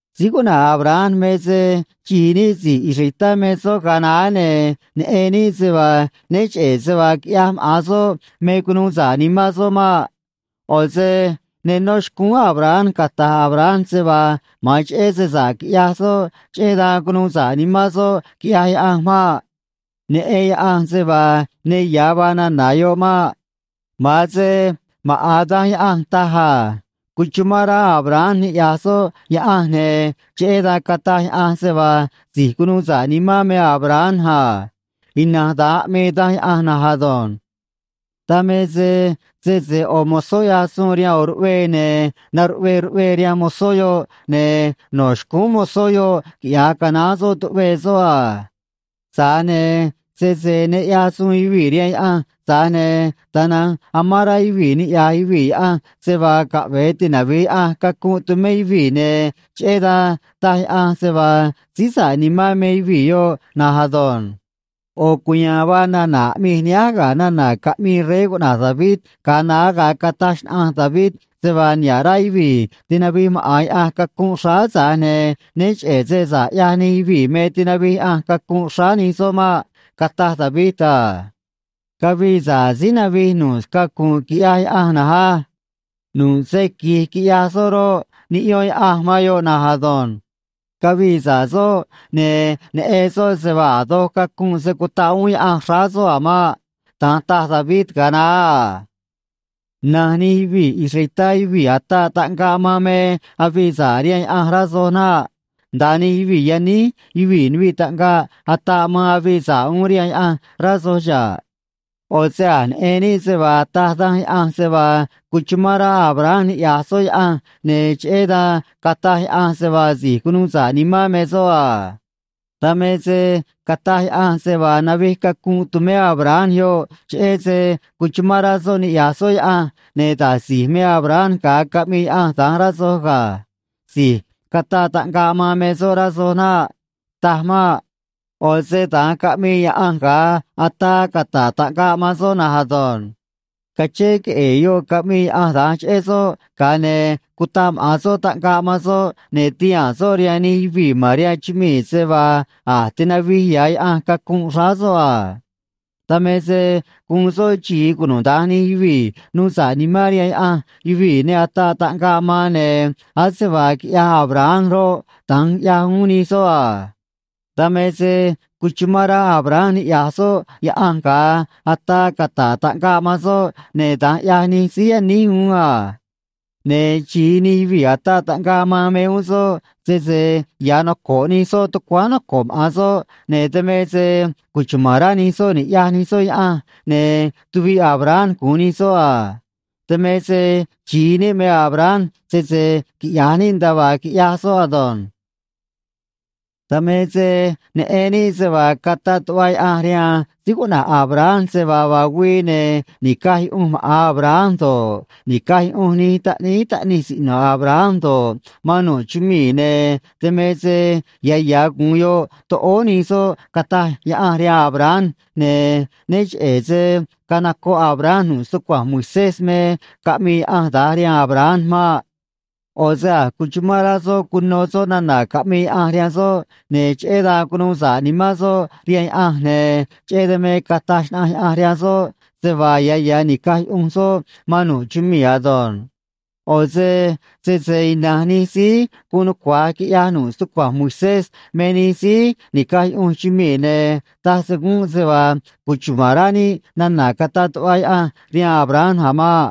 Síí cuꞌna̱j Abraham me se xi̱i níꞌ si̱j israelitá me soꞌ ga̱a naá, ne̱ neꞌen níꞌ se vaa né cheꞌe̱ se vaa quiꞌyaj maꞌa̱n soꞌ me cunuu sa̱ꞌ nimán soꞌ maꞌ. ꞌO̱ se ne nó xcúún Abraham cata̱j Abraham se vaa ma̱an cheꞌé se sa̱ꞌ quiꞌyaj soꞌ, cheꞌé dan cunuu sa̱ꞌ nimán soꞌ quiꞌyaj Yaꞌanj maꞌ. Neꞌen Yaꞌanj se vaa ne ya̱ vaa nana̱ yoꞌ maꞌ. Ma̱an se maꞌa̱n Danj Yaꞌanj taj a: “Cuchumán rá Abraham niꞌya̱j soꞌ Yaꞌanj, ne̱ cheꞌé dan cataj Yaꞌanj se vaa si̱j cunuu sa̱ꞌ nimán me Abraham a.” Ina̱nj da̱nj aꞌmii Danj Yaꞌanj na̱nj ado̱nj. Dan me se sese ꞌo̱ mozó ꞌyaj suun rihaan ꞌo̱ ruꞌvee, ne̱ na̱ruꞌvee ruꞌvee rihaan mozó yoꞌ, ne̱ no̱ xcúún mozó yoꞌ quiꞌya̱j canaán soꞌ tuꞌvee soꞌ a. Tza̱j ne̱ sese ne ꞌyaj suun yuvii̱ rihaan Yaꞌanj, tza̱j ne̱ tana̱nj amán rá yuvii̱ niꞌya̱j yuvii̱ Yaꞌanj se vaa caꞌve̱e tinavi̱j Yaꞌanj cacunꞌ tumé yuvii̱, ne̱ cheꞌé dan taj Yaꞌanj se vaa síí sa̱ꞌ nimán me yuvii̱ yoꞌ na̱nj ado̱nj. ꞌO̱ cuya̱a̱n vaa nana̱ aꞌmij nihánj ga̱ nana̱ caꞌmii rey cuꞌna̱j David ga̱a naá ga̱a cataj xnaꞌanj David se vaa niha̱ꞌ rá yuvii̱ tinavij maꞌa̱n Yaꞌanj cacunꞌ xráá, tza̱j ne̱ né cheꞌe̱ se sa̱ꞌ ꞌyaj nij yuvii̱ me tinavij Yaꞌanj cacunꞌ xráá nij soꞌ maꞌ. Cataj David a: Cavii sa̱ꞌ síí navij nu̱ꞌ scacu̱nꞌ quiꞌyaj Yaꞌanj na̱nj á. Nu̱ꞌ se qui̱j quiꞌyaj soꞌ roꞌ, niꞌyón Yaꞌanj man yoꞌ na̱nj ado̱nj. Cavii sa̱ꞌ soꞌ, ne̱ neꞌen soꞌ se vaa a̱ doj cacunꞌ se̱ cutaꞌ uún Yaꞌanj xráá soꞌ a̱ maꞌ. Da̱nj taj David ga̱a naá a. Na̱nj nij yuvii̱ israelitá yuvii̱ ataꞌ taꞌngaꞌ man me avii sa̱ꞌ rihaan Yaꞌanj, rá soj naꞌ. Nda̱a nij yuvii̱ yaníj yuvii̱ nuviꞌ taꞌngaꞌ ataꞌ man avii sa̱ꞌ uún rihaan Yaꞌanj, rá soj xa̱ꞌ. ꞌO̱ se a̱j neꞌen níꞌ se vaa taj Danj Yaꞌanj se vaa cuchumán rá Abraham niꞌya̱j soꞌ Yaꞌanj, ne̱ cheꞌé dan cataj Yaꞌanj se vaa si̱j cunuu sa̱ꞌ nimán me soꞌ a. Dan me se cataj Yaꞌanj se vaa navij cacunꞌ tumé Abraham yoꞌ, cheꞌé se cuchumán rá soꞌ niꞌya̱j soꞌ Yaꞌanj, ne̱ da̱j si̱j me Abraham ga̱a caꞌmii Yaꞌanj da̱nj, rá soj ga̱. Si̱j cataꞌ taꞌngaꞌ man me soꞌ, rá soj naꞌ. Taj maꞌ. ꞌO̱ se da̱nj caꞌmii Yaꞌanj ga̱a ataa cata̱ꞌ taꞌngaꞌ man soꞌ na̱nj ado̱nj. Cachén queꞌe̱e̱ yoꞌ caꞌmii Yaꞌanj da̱nj cheꞌé soꞌ, ga̱a ne̱ cutaꞌ maꞌa̱n soꞌ taꞌngaꞌ man soꞌ, ne̱ tihaa̱n soꞌ rihaan nij yuvii̱ ma̱n rihaan chumii̱ se vaa a̱j tinavij ya̱ Yaꞌanj cacunꞌ xráá soꞌ a. Dan me se guun soꞌ xi̱i cunuda̱nj nij yuvii̱ nuu sa̱ꞌ nimán rihaan Yaꞌanj yuvii̱ ne ataꞌ taꞌngaꞌ man, ne̱ ase vaa quiꞌyaj Abraham roꞌ, da̱nj ꞌyaj uún nij soꞌ a. Dan me se cuchumán rá Abraham niꞌya̱j soꞌ Yaꞌanj ga̱a ataa cata̱ꞌ taꞌngaꞌ man soꞌ, ne̱ da̱nj ꞌyaj nij síí yaníj uún a. Ne̱ xi̱i nij yuvii̱ ataꞌ taꞌngaꞌ man me uún soꞌ, sese ya̱ noco̱ꞌ nij soꞌ tucuáán noco̱ꞌ maꞌa̱n soꞌ, ne̱ dan me se cuchuma̱n rá nij soꞌ ni̱ꞌyaj nij soꞌ Yaꞌanj, ne̱ tuviꞌ Abraham gu̱un nij soꞌ a. Dan me se xi̱i níꞌ me Abraham, sese quiꞌya̱j níꞌ nda̱a vaa quiꞌyaj soꞌ ado̱nj. Dan me se neꞌen níꞌ se vaa cataꞌ tuꞌva Yaꞌanj rihaan síí cuꞌna̱j Abraham se vaa vaa güii, ne̱ ni̱caj yuꞌunj maꞌa̱n Abraham do̱ꞌ, ni̱caj yuꞌunj nij taꞌníí taꞌnij siꞌno̱ Abraham do̱ꞌ, man nu̱ꞌ chumii̱, ne̱ dan me se ya̱ ya̱ gu̱un yoꞌ toꞌóó nij soꞌ, cataj Yaꞌanj rihaan Abraham, ne̱ né cheꞌe̱ se canocoꞌ Abraham nu̱ꞌ stucua̱nj Moisés me caꞌmii Yaꞌanj da̱nj rihaan Abraham maꞌ. ꞌO̱ se a̱j cuchumán rá soꞌ cuno soꞌ nana̱ caꞌmii Yaꞌanj rihaan soꞌ, ne̱ cheꞌé dan cunuu sa̱ꞌ nimán soꞌ rihaan Yaꞌanj, ne̱ cheꞌé dan me cataj xnaꞌanj Yaꞌanj rihaan soꞌ se vaa ya̱ ya̱ ni̱caj yuꞌunj soꞌ man nu̱ꞌ chumii̱ ado̱nj. ꞌO̱ se sese ina̱nj nij síí guun nucua̱j quiꞌya̱j nu̱ꞌ stucua̱nj Moisés me nij síí ni̱caj yuꞌunj chumii̱, ne̱ taj se gúnꞌ se vaa cuchuma̱n rá níꞌ nana̱ cataꞌ tuꞌva Yaꞌanj rihaan Abraham a̱ maꞌ.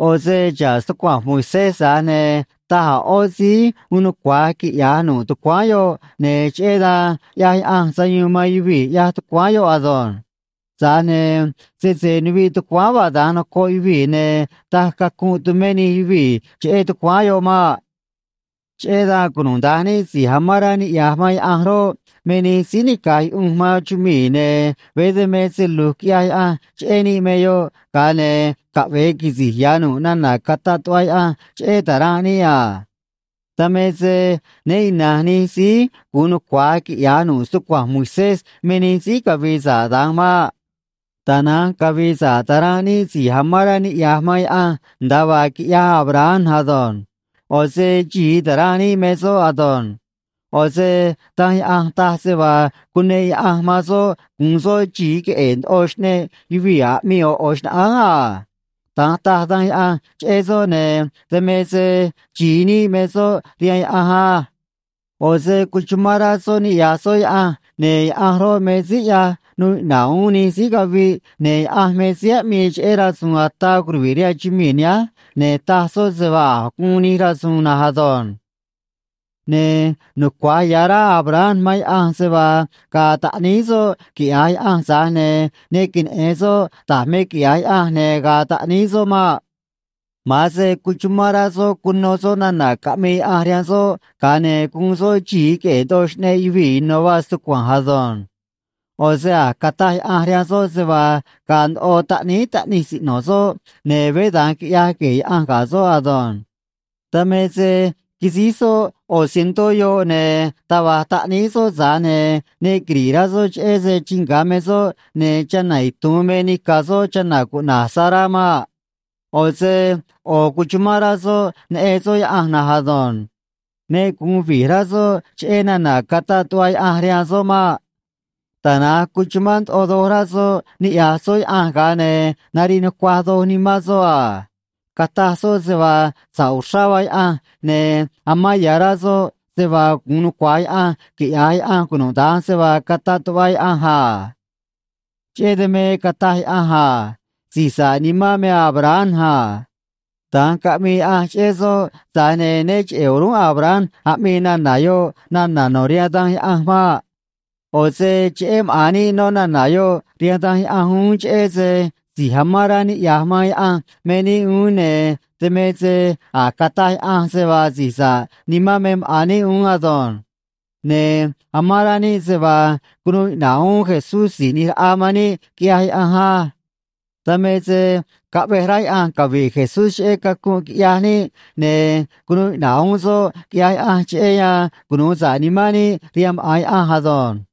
ꞌO̱ se xa̱ꞌ stucua̱nj Moisés, tza̱j ne̱ taj a̱ ꞌó síí uun nucua̱j quiꞌya̱j nu̱ꞌ tucuáán yoꞌ, ne̱ cheꞌé dan ꞌyaj Yaꞌanj sayuun man yuvii̱, ꞌyaj tucuáán yoꞌ ado̱nj. Tza̱j ne̱ sese nuviꞌ tucuáán vaa da̱nj noco̱ꞌ yuvii̱, ne̱ taj cacunꞌ tumé nij yuvii̱ cheꞌé tucuáán yoꞌ maꞌ. Cheꞌé dan cunuda̱nj níꞌ si̱j amán rá niꞌya̱j man Yaꞌanj roꞌ, me nij síí ni̱caj yuꞌunj man chumii̱, ne̱ veé dan me se lu̱j quiꞌya̱j Yaꞌanj cheꞌé níꞌ me yoꞌ, ga̱a ne̱ caꞌve̱e quisi̱j ya̱ nu̱ꞌ nana̱ cataꞌ tuꞌva Yaꞌanj cheꞌé ta̱ranꞌ níꞌ a. Dan me se né ina̱nj nij síí gu̱un nucua̱j quiꞌya̱j nu̱ꞌ stucua̱nj Moisés me nij síí cavi̱i̱ sa̱ꞌ da̱nj maꞌ. Tana̱nj cavi̱i̱ sa̱ꞌ ta̱ranꞌ níꞌ si̱j amán rá niꞌya̱j man Yaꞌanj, nda̱a vaa quiꞌyaj Abraham ado̱nj. ꞌO̱ se xi̱i ta̱ranꞌ níꞌ me soꞌ ado̱nj. ꞌO̱ se Danj Yaꞌanj taj se vaa cuneꞌ Yaꞌanj man soꞌ gu̱un soꞌ xi̱i queꞌe̱e̱ ndoꞌo xꞌneꞌ yuvii̱ aꞌmii ꞌo̱ ꞌo̱ xnaꞌánj a. Da̱nj taj Danj Yaꞌanj cheꞌé soꞌ, ne̱ dan me se xi̱i níꞌ me soꞌ rihaan Yaꞌanj á. ꞌO̱ se cuchumán rá soꞌ niꞌya̱j soꞌ Yaꞌanj, ne̱ Yaꞌanj roꞌ, me síí ꞌyaj nuu iꞌna̱ꞌ uún nij síí caviꞌ, ne̱ Yaꞌanj me síí aꞌmii cheꞌé rasu̱u̱n ataa curuvi̱ꞌ rihaan chumii̱ nihánj, ne̱ taj soꞌ se vaa a̱j guun nij rasu̱u̱n na̱nj ado̱nj. Ne̱ nucua̱j ya̱ rá Abraham man Yaꞌanj se vaa ga̱a̱ taꞌníí soꞌ, quiꞌya̱j Yaꞌanj, tza̱j ne̱ ne queneꞌe̱n soꞌ da̱j me quiꞌya̱j Yaꞌanj ne̱ ga̱a̱ taꞌníí soꞌ maꞌ. Ma̱an se cuchumán rá soꞌ cuno soꞌ nana̱ caꞌmii Yaꞌanj rihaan soꞌ, ga̱a ne̱ guun soꞌ xi̱i queꞌe̱e̱ ndoꞌo xꞌneꞌ yuvii̱ ino̱ vaa stucua̱nj ado̱nj. ꞌO̱ se a̱j cataj Yaꞌanj rihaan soꞌ se vaa ga̱a̱ ndoꞌo taꞌníí taꞌnij siꞌno̱ soꞌ, ne̱ veé da̱nj quiꞌyaj gue̱e̱ Yaꞌanj ga̱ soꞌ ado̱nj. Dan me se quisíj soꞌ ꞌo̱ cientó yoꞌ, ne̱ taj va̱j taꞌníí soꞌ, tza̱j ne̱ ne quiri̱ꞌ rá soꞌ cheꞌé se chii nga̱ me soꞌ ne̱ chana̱ itu̱un me nica̱ soꞌ chana̱ cuꞌna̱j Sará maꞌ. ꞌO̱ se ꞌo̱ cuchumán rá soꞌ neꞌen soꞌ Yaꞌanj na̱nj ado̱nj. Ne gu̱un vi̱j rá soꞌ cheꞌé nana̱ cataꞌ tuꞌva Yaꞌanj rihaan soꞌ maꞌ. Tana̱nj cuchumán ndoꞌo doj rá soꞌ niꞌya̱j soꞌ Yaꞌanj, ga̱a ne̱ nariꞌ nucuaj doj nimán soꞌ a. Cataj soꞌ se vaa sa̱ꞌ uxrá vaa Yaꞌanj, ne̱ amán ya̱ rá soꞌ se vaa gu̱un nucua̱j Yaꞌanj quiꞌya̱j Yaꞌanj cunuda̱nj se vaa cataꞌ tuꞌva Yaꞌanj a. Cheꞌé dan me cataj Yaꞌanj a: “Si̱j sa̱ꞌ nimán me Abraham a.” Da̱nj caꞌmii Yaꞌanj cheꞌé soꞌ, tza̱j ne̱ né cheꞌe̱ o̱rúnꞌ Abraham aꞌmii nana̱ yoꞌ nana̱ no̱ rihaan Danj Yaꞌanj maꞌ. ꞌO̱ se cheꞌé maꞌa̱n níꞌ no̱ nana̱ yoꞌ rihaan Danj Yaꞌanj uún, cheꞌé se si̱j amán rá niꞌya̱j man Yaꞌanj me níꞌ uún, ne̱ dan me se a̱j cataj Yaꞌanj se vaa si̱j sa̱ꞌ nimán me maꞌa̱n níꞌ uún ado̱nj. Ne̱ amán rá níꞌ se vaa cunuu iꞌna̱ꞌ uún Jesús Si̱j ꞌNi̱j Raꞌa man níꞌ quiꞌyaj Yaꞌanj á. Dan me se caꞌvej rá Yaꞌanj cavi̱ꞌ Jesús cheꞌé cacunꞌ quiꞌyaj níꞌ, ne̱ cunuu iꞌna̱ꞌ uún soꞌ, quiꞌyaj Yaꞌanj, cheꞌé yan cunu̱u sa̱ꞌ nimán níꞌ rihaan maꞌa̱n Yaꞌanj ado̱nj.